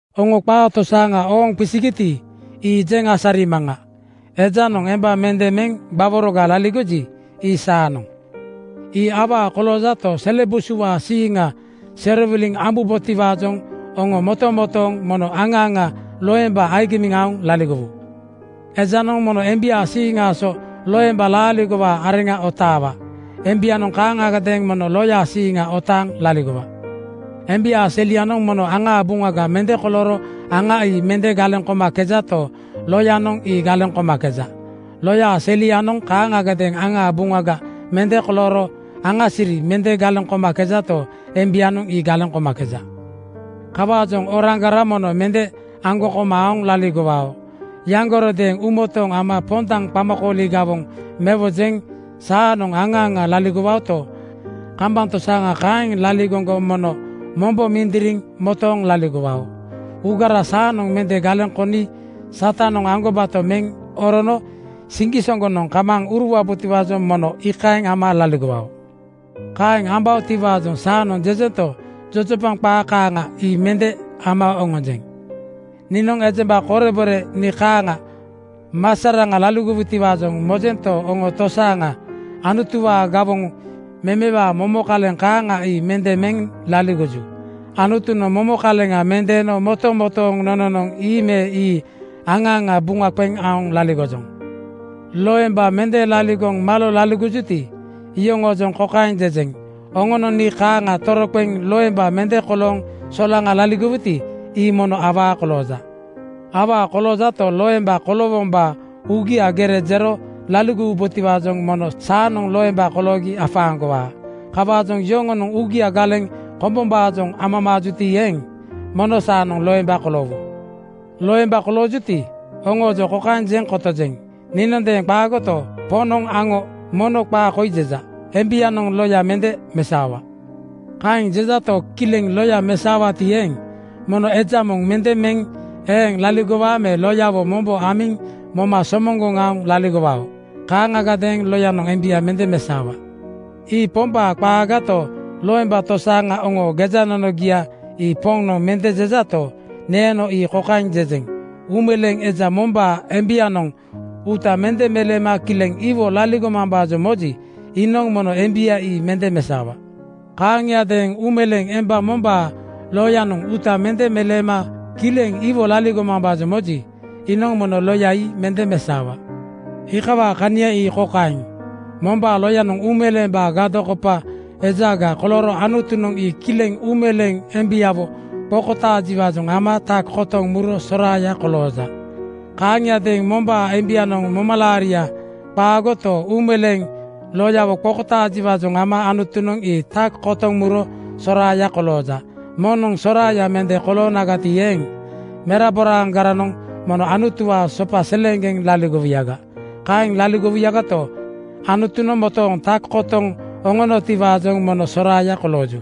Oŋo qaa tosaaŋa ooŋ qisigiti, ii jeŋ asarimaŋa. Ejanoŋ emba mende meŋ gbaworoga laligoji, ii saanoŋ. Ii awaa koloojato, sele busuwaa siiŋanoŋ serowiliŋ ambubotiwaajoŋ oŋo motomotooŋ mono aŋa aŋa loemba agimiŋ aoŋ laligowu. Ejanoŋ mono embiaa siiŋaa so loemba laaligowaa areŋa otaawa. Embianoŋ kaaŋagadeeŋ mono loyaa siiŋa otaaŋ laligowa. Embiaa selianoŋ mono aŋaa buŋaga mende kolooro aŋa ii mende galeŋ komakejato, loyanoŋ ii galeŋ komakeja. Loyaa selianoŋ kaaŋagadeeŋ aŋaa buŋaga mende kolooro aŋasiri mende galeŋ komakejato, embianoŋ ii galeŋ komakeja. Kawaajoŋ oroaŋgara mono mende aŋgoŋ koma aoŋ laligowao. Yaŋgorodeeŋ uumotooŋ ama pondaŋ qamakooli gawoŋ mewojoŋ saanoŋ aŋa aŋa laligowaoto, kambaŋ tosaaŋa kaeŋ laligoŋgo mono mombo mindiriŋ motooŋ laligowao. Uugara saanoŋ mende galeŋ koni Satanoŋ aŋgobato meŋ orono siŋgisoŋgonoŋ kamaaŋ uruwabotiwaajoŋ mono iikaeŋ ama laligowao. Kaeŋ ambaotiwaajoŋ saanoŋ jejento, jojopaŋ qaa kaaŋa ii mende ama oŋonjeŋ. Niinoŋ ejemba korebore nii kaaŋa masaraŋa laligowutiwaajoŋ mojento, oŋo tosaaŋa Anutuwaa gawoŋ memewaa momo kaleŋ kaaŋa ii mende meŋ laligoju. Anutunoŋ momo kaleŋa mendeeno motomotooŋ nononoŋ ii me ii aŋa aŋa buŋa qeŋ aoŋ laligojoŋ. Loemba mende kolooŋ malo laligojuti, oŋoojoŋ kokaeŋ jejeŋ: Oŋonoŋ nii kaaŋa toroqeŋ loemba mende kolooŋ solaŋa laligowuti, ii mono awaa kolooja. Awaa koloojato, loemba koloowombaa uugia gere jero laligowubotiwaajoŋ mono saanoŋ loemba koloogi afaaŋgowaa. Kawaajoŋ yoŋonoŋ uugia galeŋ kombombaajoŋ amamaajuti eeŋ, mono saanoŋ loemba koloowu. Loemba laligojuti, oŋoojoŋ kokaeŋ jeŋ kotojeŋ, niinondeeŋ qaagoto, Poŋnoŋ aŋo mono qaa koi jeja: Embianoŋ loya mende mesaowa. Kaeŋ jejato, kileŋ loya mesaowaati eeŋ, mono eja moŋ mende meŋ eeŋ laligowa me loyawo mombo amiŋ moma somoŋgoŋ aoŋ laligowao. Kaaŋagadeeŋ loyanoŋ embia mende mesaowa. Ii Pombaa qaagato, loemba tosaaŋa oŋoo gejanonogia ii Poŋnoŋ mende jejato, neeno ii kokaeŋ jejeŋ: Uumeleeŋ eja mombaa embianoŋ uuta mende meleema kileŋ iwo laligomambaajoŋ moji, iinoŋ mono embia ii mende mesaowa. Kaaŋiadeeŋ uumeleeŋ emba mombaa loyanoŋ uuta mende meleema kileŋ iwo laligomambaajoŋ moji, iinoŋ mono loya ii mende mesaowa. Iikawaa kania ii kokaeŋ: Mombaa loyanoŋ uumeleembaa gadokopa ejaga kolooro Anutunoŋ ii kileŋ uumeleeŋ embiawo qokotaajiwaajoŋ ama tak kotoŋ muro soraaya kolooja. Kaaŋiadeeŋ mombaa embianoŋ momalaaria qaagoto, uumeleeŋ loyawo qokotaajiwaajoŋ ama Anutunoŋ ii tak kotoŋ muro soraaya kolooja. Moŋnoŋ soraaya mende koloonagati eeŋ, meraboragaranoŋ mono Anutuwaa sopa seleeŋgeŋ laligowuyaga. Kaeŋ laligowuyagato, Anutunoŋ motooŋ tak kotoŋ oŋonotiwaajoŋ mono soraaya kolooju.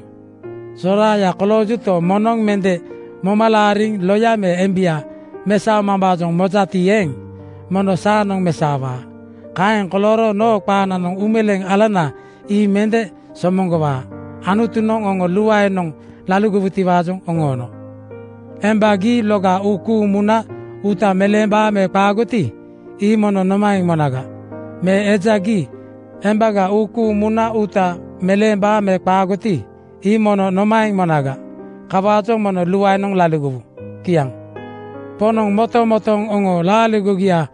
Soraaya koloojuto, moŋnoŋ mende moma laariŋ loya me embia mesaomambaajoŋ mojati eeŋ, mono saanoŋ mesaowa. Kaeŋ kolooro noo qaananoŋ uumeleeŋ alanana ii mende somoŋgowaa. Anutunoŋ oŋo luaenoŋ laligowutiwaajoŋ oŋoono. Emba, gii loga uu kuuŋ muna uuta meleembaa me qaagoti, ii mono nomaeŋ monaga? Me eja, gii embaga uu kuuŋ muna uuta meleembaa me qaagoti, ii mono nomaeŋ monaga? Kawaajoŋ mono luaenoŋ laligowu. Kiaŋ. Poŋnoŋ motomotooŋ oŋoo laaligogiaa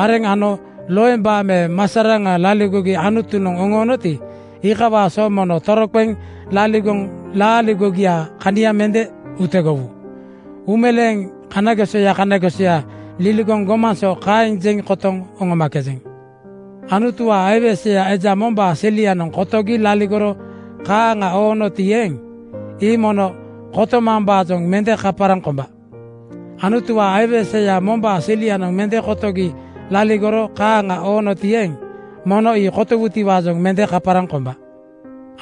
areŋ ano loemba me masaraŋa laligogi Anutunoŋ oŋoonoti, iikawaa so mono toroqeŋ laligoŋ laaligogiaa kania mende utegowu. Uumeleeŋ kanagesoya kanagesoya liligoŋ gomaŋ so kaeŋ jeŋ kotoŋ oŋomakejeŋ. Anutuwaa aiweseya eja mombaa selianoŋ kotogi laligoro kaaŋa oonoti eeŋ, ii mono kotomambaajoŋ mende kaparaŋ komba. Anutuwaa aiweseya mombaa selianoŋ mende kotogi laligoro kaaŋa oonoti eeŋ, mono ii kotowutiwaajoŋ mende kaparaŋ komba.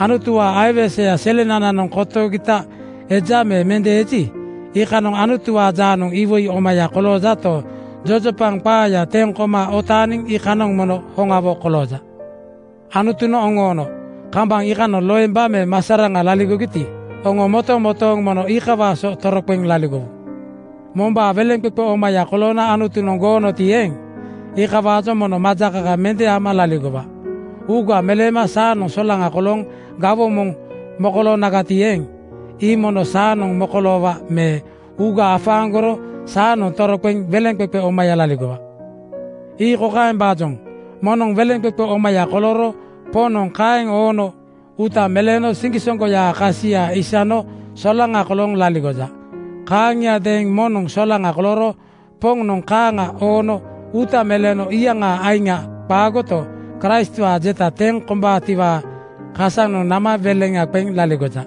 Anutuwaa aiweseya selenananoŋ kotogita eja me mende eji, iikanoŋ Anutuwaa jaanoŋ iwoi omaya koloojato, jojopaŋ qaaya teŋ koma otaaniŋ iikanoŋ mono hoŋawo kolooja. Anutunoŋ oŋoono kambaŋ iikanoŋ loemba me masaraŋa laligogiti, oŋo motomotooŋ mono iikawaa so toroqeŋ laligowu. Mombaa weleŋqeqe omaya koloona Anutunoŋ goonoti eeŋ, iikawaajoŋ mono majakaka mende ama laligowa. Uuga meleema saanoŋ solaŋa kolooŋ gawoŋ moŋ mokoloonagati eeŋ, ii mono saanoŋ mokoloowa me uuga afaaŋgoro saanoŋ toroqeŋ weleŋqeqe omaya laligowa. Ii kokaembaajoŋ: Moŋnoŋ weleŋqeqe omaya kolooro Poŋnoŋ kaeŋ oono uuta meleeno siŋgisoŋgoyaa kasia isano solaŋa kolooŋ laligoja. Kaaŋiadeeŋ moŋnoŋ solaŋa kolooro Poŋnoŋ kaaŋa oono uuta meleeno iyaŋaa aiŋa qaagoto, Kraistwaa jeta teŋ kombaatiwaa kasanoŋ nama weleŋa qeŋ laligoja.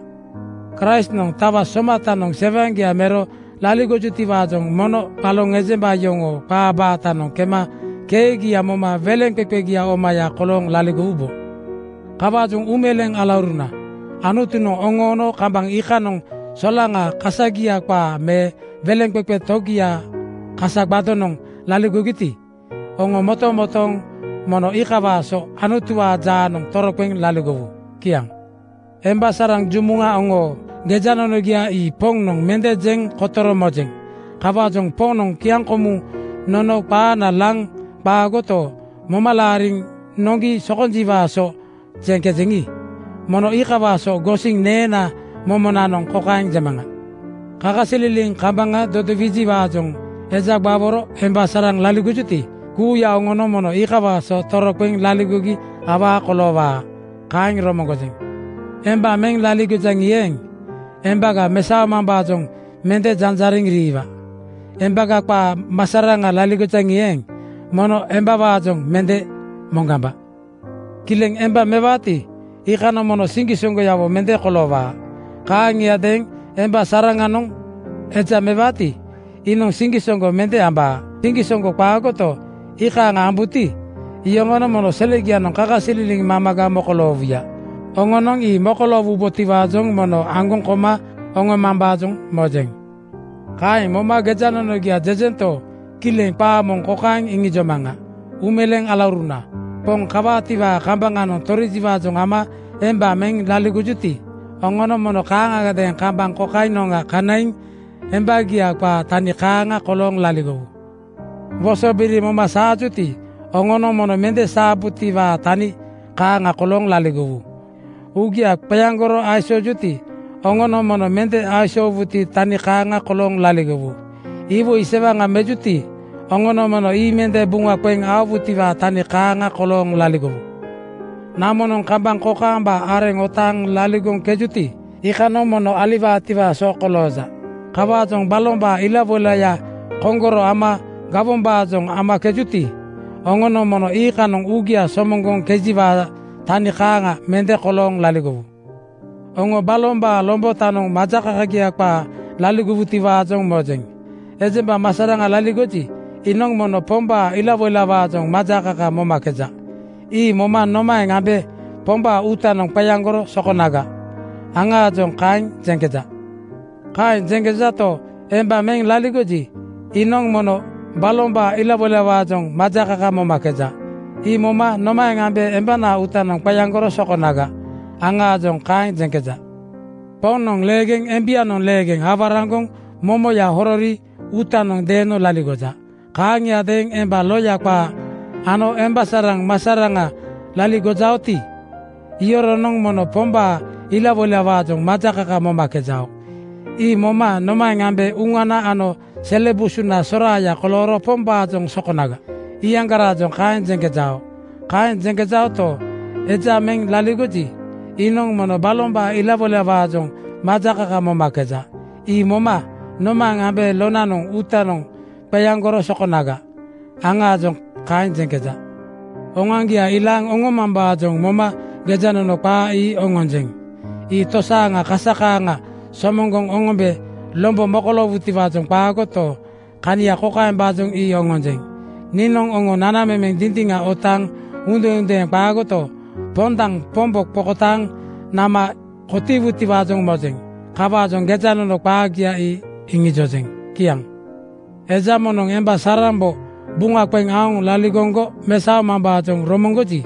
Kraistnoŋ tawa somatanoŋ sewaŋgia mero laligojutiwaajoŋ mono baloŋ ejemba yoŋoo qaa baatanoŋ kema keegia moma weleŋqeqegia omaya kolooŋ laligowubo. Kawaajoŋ uumeleeŋ alauruna, Anutunoŋ oŋoono kambaŋ iikanoŋ solaŋa kasagia qaa me weleŋqeqe togiaa kasa gbadonoŋ laligogiti, oŋo motomotooŋ mono iikawaa so Anutuwaa jaanoŋ toroqeŋ laligowu. Kiaŋ. Emba saraŋ jumuŋa oŋoo gejanonogia ii Poŋnoŋ mende jeŋ kotoro mojeŋ. Kawaajoŋ Poŋnoŋ kiaŋkomuŋ nono qaana laŋ qaagoto, moma laariŋ noŋgi sokonjiwaa so jeŋkejeŋi, mono iikawaa so gosiŋ neenaa momonanoŋ kokaeŋ jemaŋa: Kakasililiŋ kambaŋa dodowijiwaajoŋ eja gbaworo emba saraŋ laligojuti, kuuya oŋonoŋ mono iikawaa so toroqeŋ laligogi awaa koloowaa. Kaeŋ romoŋgojeŋ. Emba meŋ laligojaŋi eeŋ, embaga mesaomambaajoŋ mende janjariŋ riiwa. Embaga qaa masaraŋa laligojaŋi eeŋ, mono embawaajoŋ mende moŋgamba. Kileŋ emba mewaati, iikanoŋ mono siŋgisoŋgoyawo mende koloowaa. Kaaŋiadeeŋ emba saranoŋ eja mewaati, iinoŋ siŋgisoŋgo mende ambaa. Siŋgisoŋgo qaagoto, iikaaŋa ambuti, iyoŋonoŋ mono selegianoŋ kakasililiŋ mamaga mokoloowuya. Oŋonoŋ ii mokoloowubotiwaajoŋ mono aŋgoŋ koma oŋomambaajoŋ mojeŋ. Kaeŋ moma gejanonogia jejento, kileŋ qaa moŋ kokaeŋ iŋijomaŋa: Uumeleeŋ alauruna, Poŋ kawaatiwaa kambaŋanoŋ torijiwaajoŋ ama emba meŋ laligojuti, oŋonoŋ mono kaaŋagadeeŋ kambaŋ kokainoŋga kanaiŋ embagia qaa tani kaaŋa kolooŋ laligowu. Wosobiri moma saajuti, oŋonoŋ mono mende saabutiwaa tani kaaŋa kolooŋ laligowu. Uugia qeaŋgoro aisoojuti, oŋonoŋ mono mende aisoowutiwaa tani kaaŋa kolooŋ laligowu. Iwoi sewaŋa mejuti, oŋonoŋ mono ii mende buŋa qeŋ aowutiwaa tani kaaŋa kolooŋ laligowu. Namonoŋ kambaŋ kokaamba areŋ otaaŋ laligoŋkejuti, iikanoŋ mono aliwaatiwaa so kolooja. Kawaajoŋ balombaa ilawoilaya koŋkororo ama gawombaajoŋ amakejuti, oŋonoŋ mono iikanoŋ uugia somoŋgoŋkejiwaa tani kaaŋa mende kolooŋ laligowu. Oŋo balombaa lombotaajoŋ majakakagia qaa laligowutiwaajoŋ mojeŋ. Ejemba masaraŋa laligoji, iinoŋ mono Pombaa ilawoilawaajoŋ majakaka momakeja. Ii moma “Nomaeŋ ambe Pombaa uutanoŋ qeaŋgoro sokonaga,” aŋaajoŋ kaeŋ jeŋkeja. Kaeŋ jeŋkejato, emba meŋ laligoji, iinoŋ mono balombaa ilawoilawaajoŋ majakaka momakeja. Ii moma “Nomaeŋ ambe embanaa uutanoŋ qeaŋgoro sokonaga,” aŋaajoŋ kaeŋ jeŋkeja. Poŋnoŋ leegeŋ embianoŋ leegeŋ awaraŋgoŋ momoya horori uutanoŋ deeno laligoja. Kaaŋiadeeŋ emba loya qaa ano emba saraŋ masaraŋa laligojaoti, iyoronoŋ mono Pombaa ilawoilawaajoŋ majakaka momakejao. Ii moma “Nomaeŋ ambe uŋana ano sele busuna soraaya kolooro Pombaajoŋ sokonaga,” iyaŋgaraajoŋ kaeŋ jeŋkejao. Kaeŋ jeŋkejaoto, eja meŋ laligoji, iinoŋ mono balombaa ilawoilawaajoŋ majakaka momakeja. Ii moma “Nomaeŋ ambe lonaa uutanoŋ qeaŋgoro sokonaga,” aŋaajoŋ kaeŋ jeŋkeja. Oŋoaŋgia ilaaŋ oŋomambaajoŋ moma gejanono qaa ii oŋonjeŋ. Ii tosaaŋa kasa kaaŋa somoŋgoŋ oŋombe lombo mokoloowutiwaajoŋ qaagoto, kania kokaembaajoŋ ii oŋonjeŋ: Niinoŋ oŋo nanamemeŋ dindiŋa otaaŋ uudendeeŋ qaagoto, pondaŋ Pombo qokotaaŋ nama kotiiwutiwaajoŋ mojeŋ. Kawaajoŋ gejanono qaagia ii iŋijojeŋ. Kiaŋ. Eja moŋnoŋ emba sarambo buŋa qeŋ aoŋ laligoŋgo mesaomambaajoŋ romoŋgoji,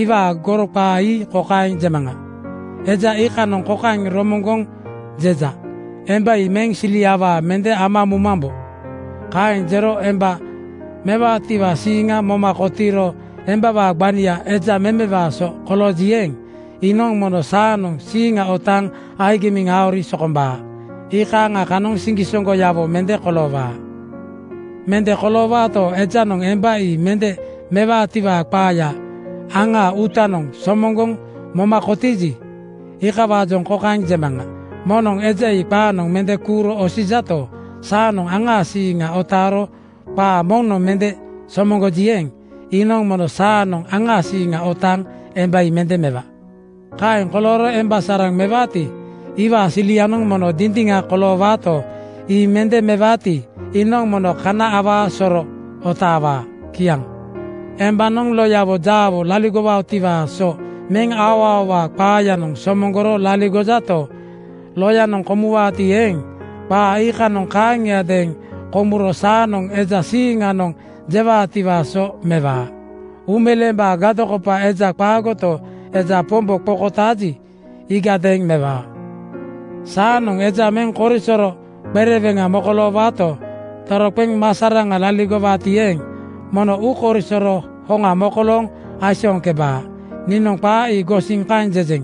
iwaa goro qaa ii kokaeŋ jemaŋa: Eja iikanoŋ kokaeŋ romoŋgoŋ jeja, “Emba ii meŋ sili awaa mende ama mumambo.” Kaeŋ jero emba mewaatiwaa siiŋa moma kotiiro embawaa gbania eja memewaa so kolooji eeŋ, iinoŋ mono saanoŋ siiŋa otaaŋ agimiŋ aori sokombaa. Iikaaŋa kanoŋ siŋgisoŋgoyawo mende koloowaa. Mende koloowaato, ejanoŋ emba ii mende mewaatiwaa qaaya aŋaa uutanoŋ somoŋgoŋ moma kotiiji, iikawaajoŋ kokaeŋ jemaŋa: Moŋnoŋ eja ii qaanoŋ mende kuuro osijato, saanoŋ aŋaa siiŋa otaaro qaa moŋnoŋ mende somoŋgoji, eeŋ, iinoŋ mono saanoŋ aŋaa siiŋa otaaŋ emba ii mende mewa. Kaeŋ kolooro emba saraŋ mewaati, iwaa silianoŋ mono dindiŋa koloowaato, ii mende mewaati, iinoŋ mono kana awaa soro otaawaa. Kiaŋ. Embanoŋ loyanoŋ jaawo laligowaatiwaa so meŋ aoaowaa qaayanoŋ somoŋgoro laligojato, loyanoŋ komuwaati eeŋ, qaa iikanoŋ kaaŋiadeeŋ komuro saanoŋ eja siiŋanoŋ jewaatiwaa so mewaa. Uumeleembaa gadokopa ejaga qaagoto, eja Pombo qokotaaji, iigadeeŋ mewaa. Saanoŋ eja meŋ korisoro qereweŋa mokoloowaato, toroqeŋ masaraŋa laligowaati eeŋ, mono uukoisoro hoŋa mokolooŋ aisooŋkebaa. Niinoŋ qaa ii gosiŋ kaeŋ jejeŋ.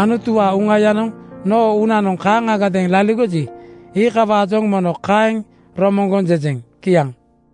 Anutuwaa Uŋayanoŋ noo uunanoŋ kaaŋagadeeŋ laligoji, iikawaajoŋ mono kaeŋ romoŋgoŋ jejeŋ. Kiaŋ.